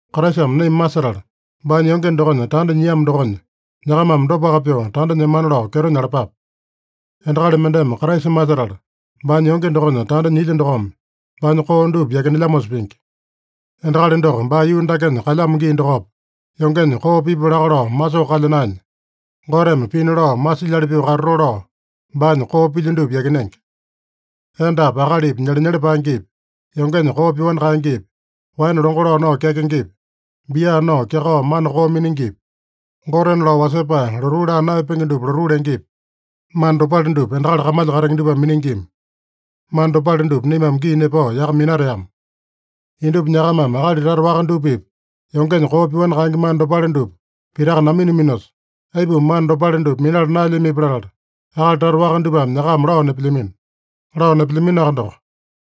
Kraisame naima masetala baanya yonge dokonya tanda nyiamo dokonya, nyakamame dopaka pyoo tanda nyemana lao kyeto nyalapape. Endakali mendeme Kraisa masetala baanya yonge dokonya tanda nyilya dokome baanya koo dupa yakinelyamosa pingi. Endakali doko baa yuu dakenya kalyamo gii dokopa, yongenya koo pipu laka lao masoo kalya naenya, Goteme pina lao masilyali pyoo katatoo lao baanya koo pilya dupa yakinenge. Endapi akalipi nyelenyele paengepi, yongenya koo pyoani kaengepi, waene longo lao nao kyakengepi, bia nao kyakao mana koo miningipi, gotena lao wasepae lotuu laa naeyapenge dupa lotuu lengepi, mana dopale dupa endakali kamalya katenge dupame miningima. Mana dopale dupa naimame gii nepao yaka minateama. Indupa nyakamame akali tata waka dupa-pipa yongenya koo pyoani kaenge mana dopale dupa pitaka naminaminosa, aipuma mana dopale dupa minala naelyamipi latala, akali tata waka dupame nyakama lao nepelyamino. Lao nepelyaminoaka doko,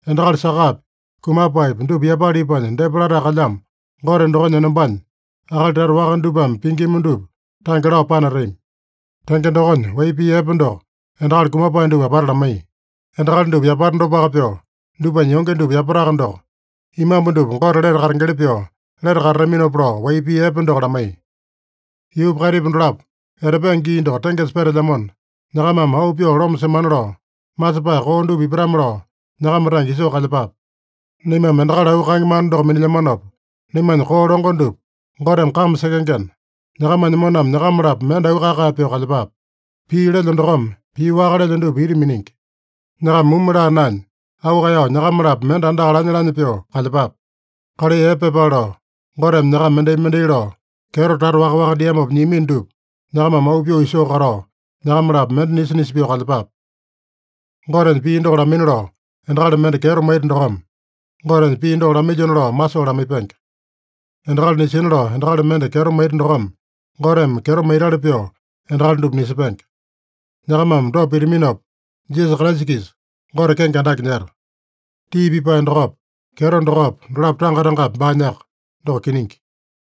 endakali sakapi, kumapaepi dupa yapala ipanya depa latae kalyamo Gote dokonya enombanya, akali tata waka dupame pingima dupa tange lao panatami. Tenge dokonya, wai pii epe doko endakali kumapae dupa apata lamaiya. Endakali dupa yapata dopaka pyoo, dupanya yonge dupa yapataka doko, imambu dupa Gote lete katengeli pyoo lete katataminopa lao, wai pii epe doko lamaiya. Yuupa kaitipa dolapo etapenge gii doko tengesa petelyamona, nyakamame auu pyoo loma semana lao, masepae koo dupa ipatame-lao nyakama tange isoo kalyepape. Naimame endakali auu kaenge mana doko minilyamanopa, naimanya koo longo dupa Goteme kame sekengena, nyakamanya moname nyakama-lapo mende auu kae-kae pyoo kalyepape. Pii lelyo dokome pii waka lelyo dupa ita miningi. Nyakama mumu laa naenya, auu kaeyao nyakama-lapo mende andaka lanya-lanya pyoo kalyepape. Kalai epe pyepale lao, Goteme nyakama mendai-mendai lao kyeto tata waka-waka diamopa nyiamino dupa nyakamame auu pyoo isoo katao, nyakama-lapo mende nisa-nisa pyoo kalyepape. Gotenya pii doko lamaina lao endakali mende kyeto maita dokome, Gotenya pii doko lamailyona lao masoo lamaipenge. Endakali nisina lao endakali mende kyeto maita dokome, Goteme kyeto maitali pyoo endakali dupa nisepenge. Nyakamame dopa pitaminopa, Jisasa Kraisa-kisa Gote kenge andake nyeta. Tii pipae dokopa, kyeto dokopa, dolapo tanga-tangapi baanyaka. Doko kiningi.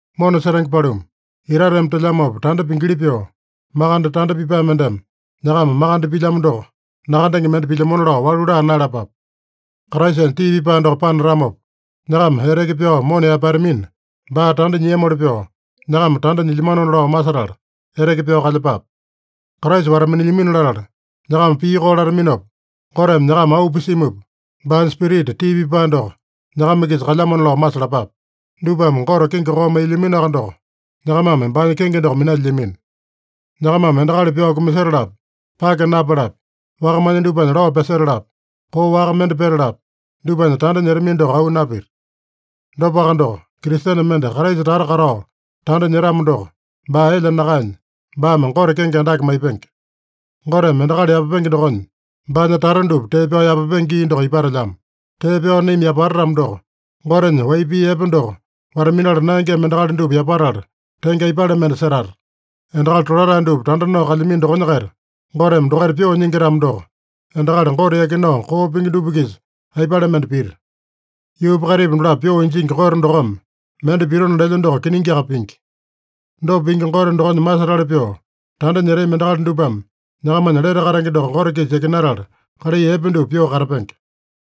Mona setenge paluma, itateme telyamopa tanda pingili pyoo, makande tanda pipae mendeme nyakama makande pilyamo doko, nakandenge mende pilyamona lao walu laa naeyalapape. Kraisanya tii pipae doko panatamopa, nyakama eteke pyao mona yaepatamina, baa tanda nyiamoli pyoo, nyakama tanda nyilyamanona lao masetala, eteke pyao kalyepape. Kraisa wata-minilyamino latala, nyakama pii koo lataminopa, Goteme nyakama auu pisimupa, baanya Spirita tii pipae doko nyakama-kisa kalyamona lao masalapape. Dupame Gote kenge koo mailyaminoaka doko, nyakamame baanya kenge doko minalyilyamino. Nyakamame endakali pyao kumasetalapi, pake napalapi, wakamanya dupanya lao pyasetalapi, koo waka mende petalapi, dupanya tanda nyetamino doko auu napita. Dopaka doko, Kristene mende Kraisa tata katao tanda nyetamo doko, baa elya nakaenya, baame Gote kenge andake maipenge. Goteme endakali yapapenge dokonya, baanya tata dupa tee pyao yapapenge gii doko ipatelyamo. Tee pyao naima yapata-tamo doko, Gotenya wai pii epe doko wata-minala naengema endakali dupa yapatala, tenge aipale mende setata? “Endakali tolatae dupa tanda nao kalyamino dokonya-kaita Goteme dokaita pyoo nyingi-tamo doko, endakali Gote yakinao koo pingi dupa-kisa aipale mende pita?” Yuupa kaitipa dolapo pyoo injingi Gote dokome mende pitona lelya doko kiningiaka pingi. Dopa pingi Gote dokonya masetali pyoo tanda nyetami endakali dupame nyakamanya lete katenge doko Gote-kisa yakinatala, kalai epe dupa pyoo katapenge.